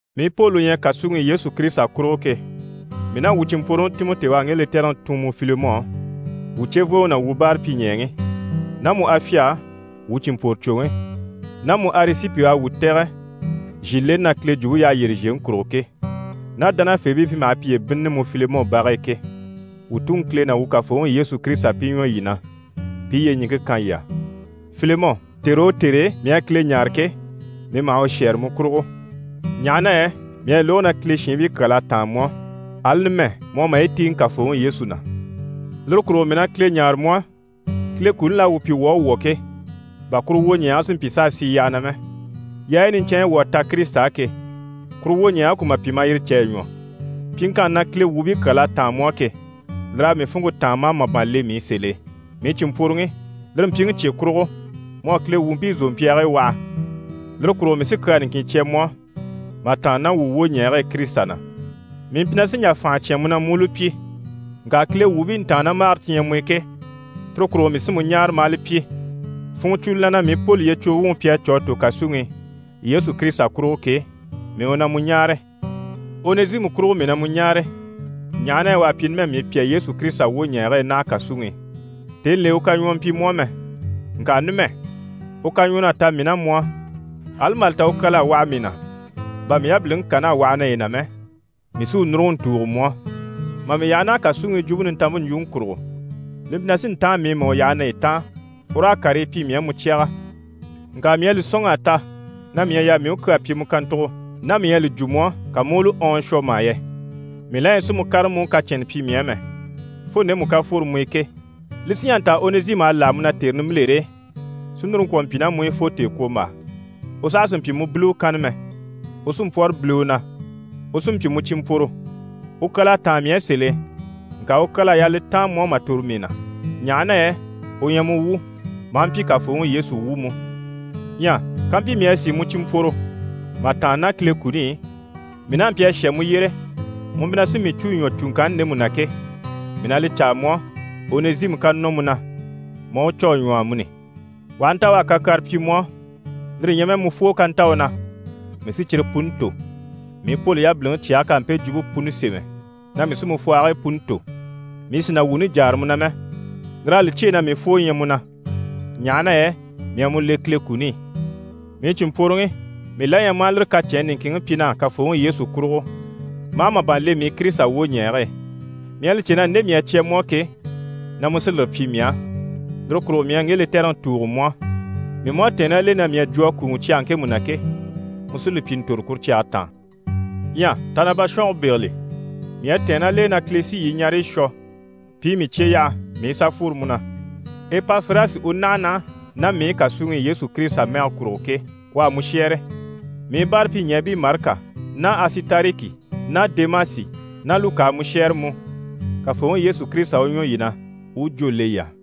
Mii Poli u ɲyɛ kàsuŋi i Yesu Kirisita kurugo ke, mii ná wuu cìnmpworoŋi Timɔti u à ŋge lɛtɛrɛŋi tun mu Filemɔ á, wuu cevooŋi ná wuu báarapyiɲɛɛŋi, ná mu Afya á wuu cìnmpworocwoŋi ná mu Arisipi u à wuu tɛ̀gɛ zhìleni na Kile jwumpe yyaha yyére zhèŋi kurugo ke, ná dánafeebii pi maha piye bínnini mu Filemɔ bage e ke. Wuu Tuŋi Kile ná wuu Kafooŋi Yesu Kirisita pi ɲwɔ yii na, pi i yyeɲiŋke kan yii á. Filemɔ, tère o tère e mii à Kile ɲáare ke, mii maha u shɛ́ɛre mu kurugo, ɲaha na yɛ mii à lógo na Kile shiinbii kyal'à táan mu á, ali numɛ mu à maye tíiŋɛ Kafooŋi Yesu na. Lire kurugo mii na Kile ɲáare mu á, Kile kuni l'à wuu pyi wuu à wwɔ̀ ke, bà kuru wwoɲɛɛge si mpyi s'a sì yyaha na mɛ, yaayi niɲcɛnɲyi wuu à ta Kirisita á ke, kuru wwoɲɛɛge ku ma pyi mà yire cè a ɲwɔ. Pyiŋkanni na Kile wuubii kyal'à táan mu á ke, lir'à mii funŋke táan maa màban le mii i sèl'e. Mii cìnmpworoŋi, lire mpyiŋi cye kurugo, mu à Kile wuubii zòmpyaagii waha. Lire kurugo mii sí kyaa niŋkin cya mu á. Mà tàanna ná wuu wwoɲɛɛge e Kirisita na, mii mpyi na sí n‑jà fànha cyán mu na mu u li pyi. Ŋka Kile wuubii ntàannamagare ti ɲyɛ mu i ke, tire kurugo mii sí mu ɲáare ma a li pyi. Funŋɔ cwo li na na mii Poli yyecwugo wuŋi pi à cû a tò kàsuŋi i Yesu Kirisita kurugo ke, mii u na mu ɲáare. Onɛzimu kurugo mii na mu ɲáare, ɲaha na yɛ u à pyi numɛ mii pyà Yesu Kirisita wwoɲɛɛge e naha kàsuŋi i. Tèni l'e, u kaɲwɔɔ mpyi mu á mɛ. Ŋka numɛ, u kaɲwɔɔn'à ta mii ná mu á. Ali mà li ta u kyal'à waha mii na bà mii yabiliŋi kan'à waha naye na mɛ, mii sí u núruŋɔ n‑tùugo mu á. Mà mii yaha naha kàsuŋi i Jwumpe Nintanmpe ɲjwuŋi kurugo, li mpyi na sí n-táan mii i mà u yaha naye taan, u raa karii pyi mii á mu cyaga. Ŋka mii à li sɔ̂nŋ'a ta na mii ɲyɛ a yaa mii u kyaa pyi mu kàntugo ná mii ɲyɛ a li jwo mu á, ka mu u li ɔɔn shwɔ mà yɛ. Mii la ɲyɛ sì mu kárama mu u kacɛnnɛ pyi mii á mɛ, fo ndemu ká fworo mu i ke. Li sí n‑jà n‑ta Onɛzimu à láha mu na tère nimbilere e, si núru ŋkwɔ̀ mpyi ná mu i fo tèekwombaa. U saha sì n‑pyi mu biliwe kanna mɛ, u sí n‑pwɔ́rɔ biliwe na, u sí n‑pyi mu cìnmpworo. U kyal'à táan mii á sèl'e, ŋka u kyal'à yaa li taan mu á mà tòro mii na, ɲaha na yɛ u ɲyɛ mu wu, maa mpyi Kafooŋi Yesu wu mú. Ɲyɛ kampyi mii à sìi mu cìnmpworo mà tàanna ná Kile kuni i, mii n'a mpyi a shà mu yyére, mu mpyi na sí mii cû ɲwɔ cùŋkanni ndemu na ke, mii na li caa mu á, Onɛzimu ká nɔ mu na, ma a u cû a ɲwɔ amuni. U aha nta u à kakyara pyi mu á, lire ɲyɛ mɛ mu fwoo ká nta u na, mii sí cyire puni tò. Mii Poli yabiliŋi cyɛge k'à mpe jwumpe puni sémɛ na mii sí mu fwɔhigii puni tò, mii sì na wuuni jáara mu na mɛ, lir'à li cyêe na mii fwoo ɲyɛ mu na, ɲaha na yɛ mii à mu le Kile kuni i. Mii cìnmpworoŋi, mii la ɲyɛ ma a lire kacɛnni niŋkinŋi pyi na á Kafooŋi Yesu kurugo, ma a màban le mii i Kirisita wwoɲɛɛge e. Mii à li cè na nde mii à cya mu á ke, na mu sí lire pyi mii á. Lire kurugo mii à ŋge lɛtɛrɛŋi tùugo mu á. Mii mú à tɛ̀ɛn ná l'e na mii à jwo a kùuŋɔ cyage ŋkemu na ke, mu sí li pyi n‑tòro kuru cyage taan. Ɲyɛ ta na bashɔnge bégeli, mii à tɛ̀ɛn ná l'e, Kile sí yii ɲareyi shwɔ pi i mii cye yaha mii i sà fworo mu na. Epafirasi u naha naha ná mii i kàsuŋi i Yesu Kirisita mɛgɛ kurugo ke, u à mu shɛ́ɛre. Mii báarapyiɲɛɛbii Marika ná Asitariki ná Demasi ná Luka à mu shɛ́ɛre mú. Kafooŋi Yesu Kirisita u ɲwɔ yii na, u u jwó le yii á.